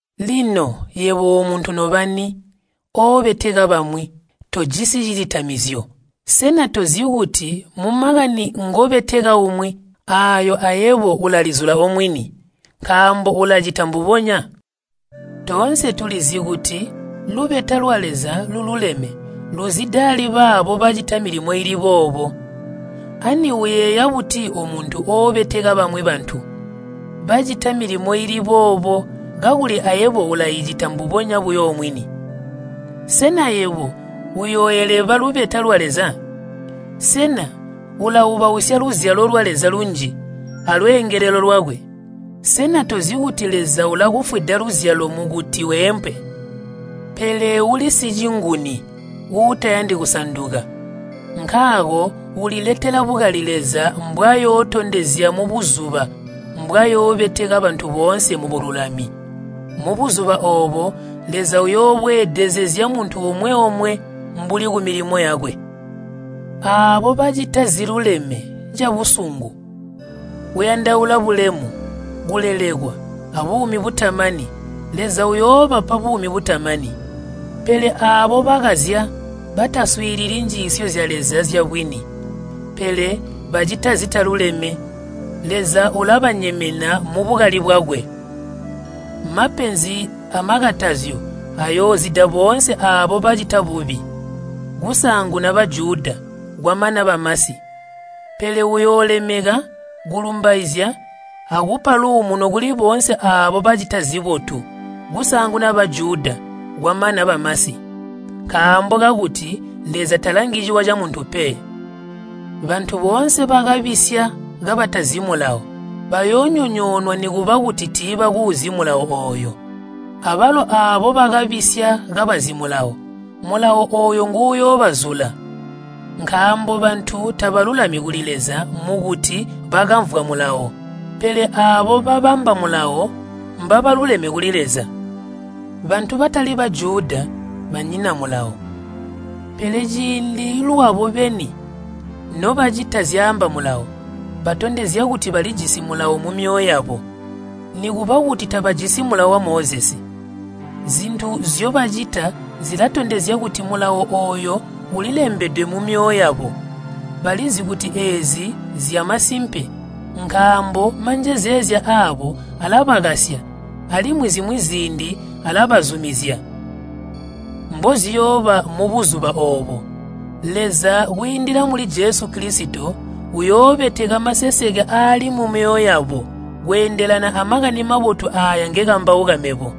Lino, yebo omuntu nobani, oobeteka bamwi, tojisi cilitamizyo. Sena tozi kuti mumakani ngobeteka umwi aayo ayebo ulalizula omwini, nkaambo ulacita mbubonya? Toonse tulizi kuti lubeta lwa Leza lululeme luzida ali baabo bacita milimo iili boobo. Ani uyeeya buti omuntu ooboteka bamwi bantu bacita milimo iili boobo kakuli ayebo ulaicita mbubonya buyo omwini? Sena yebo uyooeleba lubeta lwa Leza? Sena ulaubausya luzyalo lwa Leza lunji alweengelelo lwakwe? Sena tozi kuti Leza ulakufwida luzyalo mukuti weempe? Pele uli sicinguni uutayandi kusanduka, nkaako uliletela bukali Leza mbwayootondezya mubuzuba mbwayoobeteka bantu boonse mubululami. Mubuzuba oobo Leza uyoobweedezezya muntu omwe-omwe mbuli kumilimo yakwe. Aabo bacita ziluleme cabusungu, kuyandaula bulemu, kulelekwa, abuumi butamani, Leza uyoobapa buumi butamani. Pele aabo bakazya, bataswiilili njiisyo zya Leza zyabwini, pele bacita zitaluleme, Leza ulabanyemena mubukali bwakwe. Mapenzi amakatazyo ayoozida boonse aabo bacita bubi, kusaanguna Bajuda, kwamana bamasi. Pele uyoolemeka, kulumbaizya, akupa luumuno kuli boonse aabo bacita zibotu, kusaanguna Bajuda, kwamana bamasi. Nkaambo kakuti Leza talangi ciwa camuntu pe. Bantu boonse bakabisya kabatazi Mulawo bayoonyonyoonwa nikuba kuti tiibakuuzi Mulawo ooyo. Abalo aabo bakabisya kabazi Mulawo, Mulawo ooyo nguuyoobazula. Nkaambo bantu tabalulami kuli Leza mukuti bakamvwa Mulawo. Pele aabo babamba Mulawo, mbabaluleme kuli Leza. Bantu batali Bajuda banyina Mulawo, pele ciindi lwabo beni nobacita zyaamba Mulawo, batondezya kuti balijisi Mulawo mumyoyo yabo, nikuba kuti tabajisi Mulawo wa Mozesi. Zintu nzyobacita zilatondezya kuti Mulawo ooyo ulilembedwe mumyoyo yabo. Balizi kuti eezi nzyamasimpe nkaambo manjezeezya aabo alabakasya, alimwi zimwi ziindi alabazumizya. Mboziyooba mubuzuba oobo, Leza kwiindila muli Jesu Kilisito, uyoobeteka maseseke aali mumyoyo yabo, kweendelana a Makani Mabotu aaya ngekambauka mebo.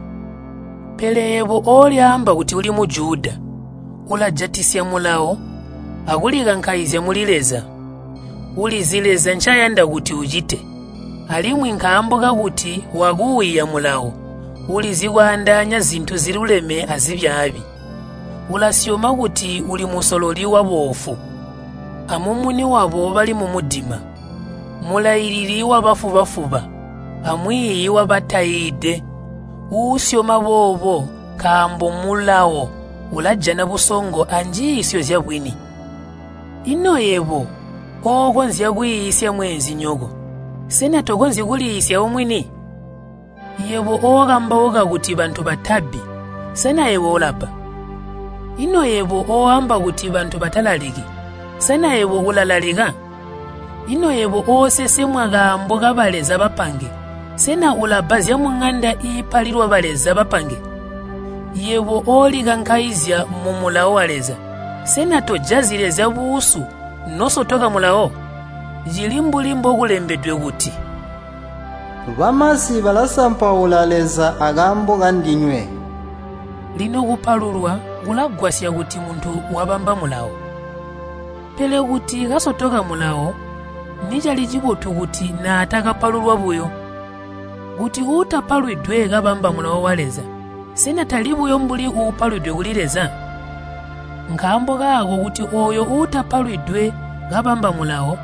Pele yebo olyaamba kuti uli Mujuda, ulajatisya Mulawo akulikankaizya muli Leza. Ulizi Leza ncayanda kuti ucite, alimwi nkaambo kakuti wakuuiya Mulawo, ulizi kwaandaanya zintu ziluleme azibyaabi. Ulasyoma kuti uli musololi waboofu, amumuni wabo bali mumudima, mulailili wabafuba-fuba, amwiiyi wabataiide. Usyoma boobo nkaambo mu Mulawo ulajana busongo anjiisyo zyabwini. Ino yebo ookonzya kwiisya mweenzinyoko, sena tokonzyi kuliiisya omwini? Yebo okambauka kuti bantu batabbi, sena yebo ulabba? Ino yebo ooamba kuti bantu batalaliki, sena yebo ulalalika? Ino yebo oosesemwa kaambo kabaleza bapange, sena ulabba zyamuŋanda iipaililwa baleza bapange? Yebo oolikankaizya mu Mulawo wa Leza, sena tojazyi Leza buusu nosotoka Mulawo? Cili mbuli mbokulembedwe kuti, “Bamasi balasampaula Leza akaambo kandinywe.” Lino kupalulwa kulagwasya kuti muntu wabamba Mulawo. Pele kuti kasotoka Mulawo nicali cibotu kuti natakapalulwa buyo. Kuti uutapalwidwe kabamba Mulawo wa Leza, sena tali buyo mbuli uupalwidwe kuli Leza? Nkaambo kaako kuti ooyo uutapalwidwe kabamba Mulawo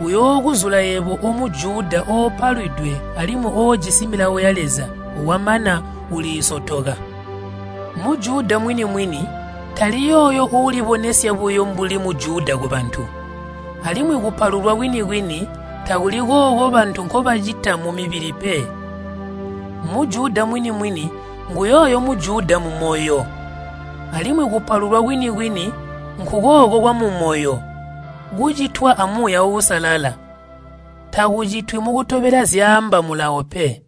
uyookuzula yebo o Mujuda oopalwidwe alimwi oojisi Milawo ya Leza wamana uliisotoka. Mujuda mwini-mwini tali yooyo uulibonesya buyo mbuli Mujuda kubantu. Alimwi kupalulwa kwini-kwini takuli kooko bantu nkobacita kumubili pe. Mujuda mwini-mwini nguyooyo Mujuda mumoyo. Alimwi kupalulwa kwini-kwini nkukooko kwamumoyo, kucitwa a Muuya Uusalala. Takucitwi mukutobela zyaamba Mulawo pe.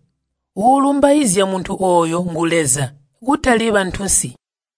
Uulumbaizya muntu ooyo ngu Leza, kutali bantunsi.